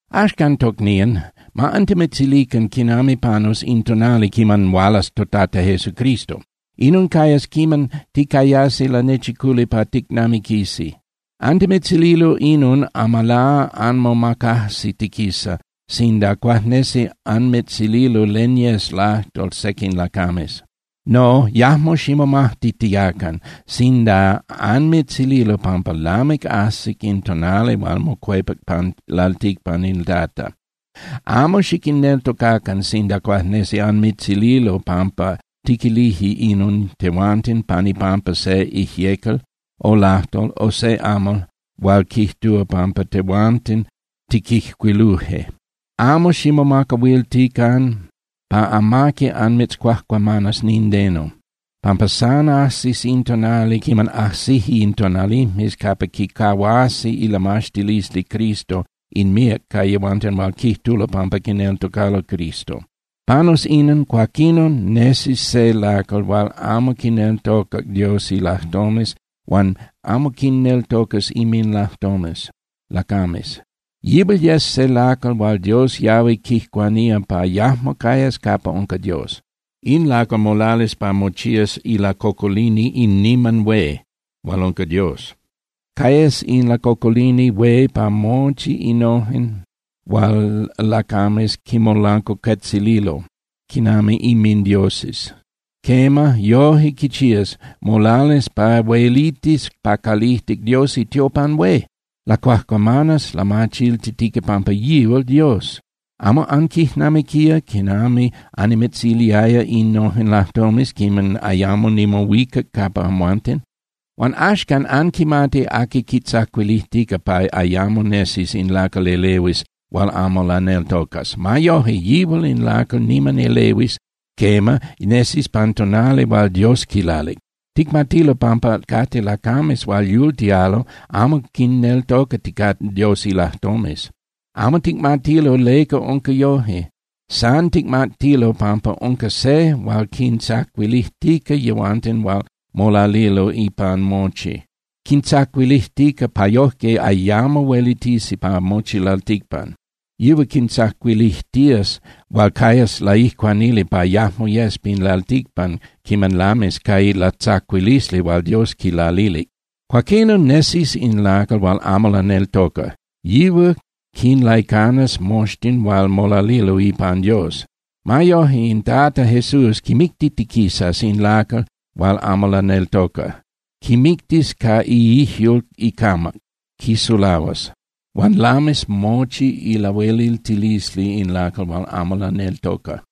Axcan, tocnían, ma antimitzilican quinami panus in tonali quiman hualas toTata Jesucristo. Inon cayas quiman ticayasi lanechiculi pa ticnamiquisi. Antimitzililo inon amalá anmomacajsitiquisa sinda cuajnesi anmitzililo len yes lajtol sequin lacames. No, yajmo ximomajtitiacan sinda anmitzililo pampa lamic ajsic in tonali hual mocuepac pan lalticpan in Tata. Amo xiquinneltocacan sinda cuajnesi anmitzililo pampa tiquilije inon tehuanten pan ipampa se ijyecal o lajtol o se amal hual quijtúa pampa tehuanten tiquijcuiluje. Amo ximomacahuiltican pa amaqui anmitzcuajcuamanas nindeno, pampa san ajsis in tonali quiman ajsije in tonalijmes capa quicahuasi ilamaxtilisli Cristo in míac ca yehuanten hual quijtulo pampa quineltocalo Cristo. Panus inon, cuaquinon nesis se lacal hual amo quineltocas Dios ilajtomes huan amo quinneltocas inminlajtomes lacames. Yihual yes se lacal hual Dios yahui quijcuanía pa yajmo cayas capa unca Dios. In lacal molalis pa mochías ilacocolini in niman hué, hual unca Dios. Cayas in lacocolini hué pa mochi innojen hual lacames quinmolancuacuetzililo quinami inmindioses. Quema, yoje quichías, molalis pa huelitis pa calijtic Dios itiopan hué. Lacuajcuamanas, lamachiltitica pampa yihual Dios. ¿Amo anquijnamiquía quinami annimitziliaya innojen lajtomes quiman ayamo nimohuicac capa amhuanten? Huan axan anquimati aqui quitzacuilijtica pa ayamo nesis in lacal elehuis hual amo laneltocas. Ma yoje, yihual in lacal niman elehuis, quema, nesis pan tonali hual Dios quilalic. Ticmatilo pampa cate lacames hual yultialo amo quinneltocaticate Dios ilajtomes. Amo ticmatilo leca unca yoje. San ticmatilo pampa unca se hual quintzacuilijtica yehuanten hual molalilo ipan mochi. Quintzacuilijtica pa yoje ayamo huelitisi pa mochi lalticpan. Yihual quintzacuilijtías huan cayas laijcuanili pa yajmo yes pin lalticpan quiman lamis ca ilatzacuilisli hual Dios quilalilic. Cuaquinon nesis in lacal hual amo laneltoca, yihual quinlaicanas moxtin hual molalilo ipan Dios. Ma yoje, in Tata Jesús quimictitiquisas in lacal hual amo laneltoca. Quimictis ca iijyul icamac, quisulahuas. Huan lamis mochi ilahueliltilisli in lacal hual amo laneltoca.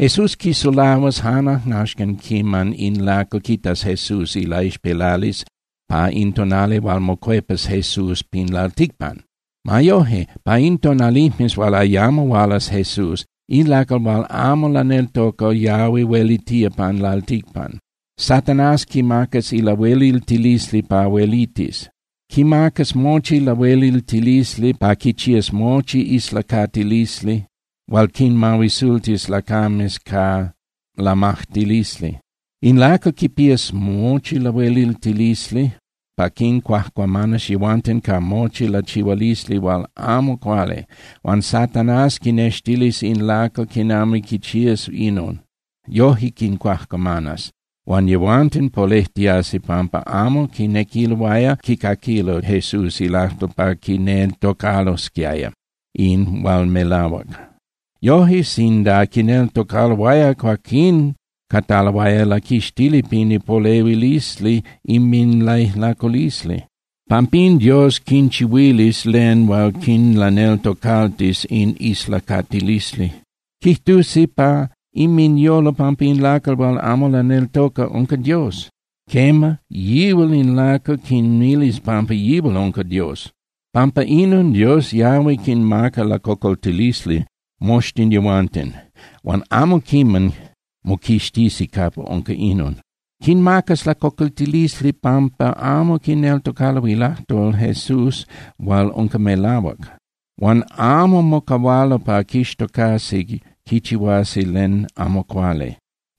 Jesús quisulahuas jan ajnaxcan quiman in lacal quitas Jesús ilaixpelalisli pa in tonali hual mocuepas Jesús pin lalticpan. Ma yoje, pa in tonalijmes hual ayamo hualas Jesús, in lacal hual amo laneltoca yahui huelitía pan lalticpan. Satanás quimacas lahueliltilisli pa huelitis. Quimacas mochi lahueliltilisli pa quichías mochi islacatilisli hual quinmahuisultis lacames ca lamajtilisli. In lacal quipías mochi lahueliltilisli pa quincuajcuamanas yehuanten ca mochi lachihualisli hual amo cuali. Huan Satanás quinextilis in lacal quinami quichías inon. Yoje quincuajcuamanas, huan yehuanten polejtiasi pampa amo quinequiloaya quicaquilo Jesús ilajtol pa quineltocalosquiaya in hual melahuac. Yoje sinda quineltocaloaya, cuaquín cataloaya laquixtili pin ipolehuilisli inminlaijlaculisli. Pampín Dios quinchihuilis len hual quinlaneltocaltis in islacatilisli. Quijtusi pa inminyolo pampa in lacal hual amo laneltoca unca Dios. Quema, yihual in lacal quinmilis pampa yihual unca Dios. Pampa inon, Dios yahui quinmaca lacocoltilisli moxtin yehuanten, huan amo quiman moquixtisi capa unca inon. Quinmacas lacocoltilisli pampa amo quineltocalo ilajtol Jesús hual unca melahuac, huan amo mocahualo pa quixtocasi quichihuasi len amo cuali.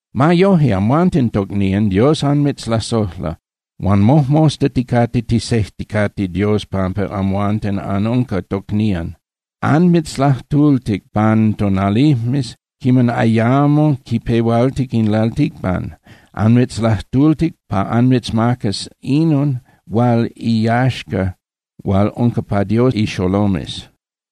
Ma yoje, amhuanten, tocnían, Dios anmitzlasojla, huan mojmosta ticate ticsejticate Dios pampa amhuanten anunca tocnían. Anmitzlajtultic pan tonalijmes quiman ayamo quipehualtic in lalticpan. Anmitzlajtultic pa anmitzmacas inon hual iyaxca hual unca pa Dios ixolomes.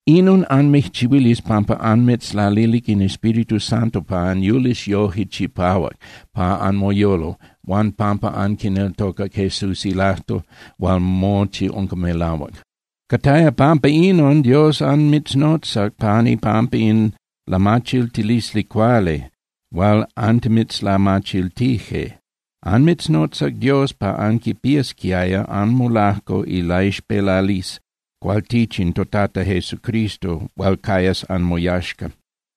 Inon anmijchihuilis pampa anmitzlalilic in Espíritu Santo pa anyulis yoje chipahuac pa anmoyolo, huan pampa anquineltocac Jesús ilajtol hual mochi unca melahuac. Cataya pampa inon Dios anmitznotzac pan ipampa in lamachiltilisli cuali hual antimitzlamachiltije. Anmitznotzac Dios pa anquipiasquiaya anmolajco ilaixpelalisli cualtichin toTata Jesucristo hual cayas anmoyaxca.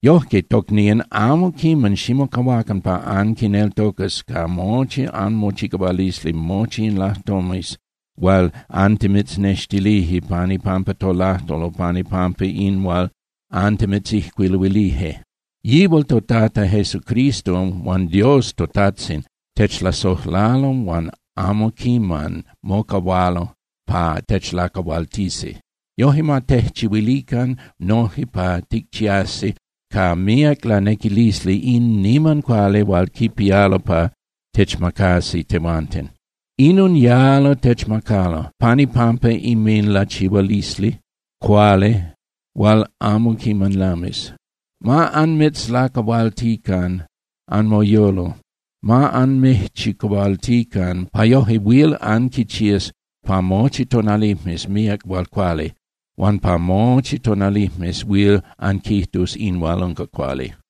Yojque, tocnían, amo quiman ximocahuacan pa anquineltocas ca mochi anmochicahualisli mochi in lajtomes hual antimitznextilije pan ipampa tolajtol o pan ipampa in hual antimitzijcuiluilije. Yihual toTata Jesucristo huan Dios toTajtzin techlasojlalo huan amo quiman mocahualo pa techlacahualtisi. Yoje ma tejchihuilican noje pa ticchiasi ca míac lanequilisli in niman cuali hual quipialo pa techmacasi tehuanten. Inon yalo techmacalo pan ipampa inminlachihualisli cuali hual amo quiman lami. Ma anmitzlacahualtican anmoyolo, ma anmijchicahualtican pa yoje huil anquichías pa mochi tonalijmes míac hual cuali, huan pa mochi tonalijmes huil anquijtus in hual unca cuali.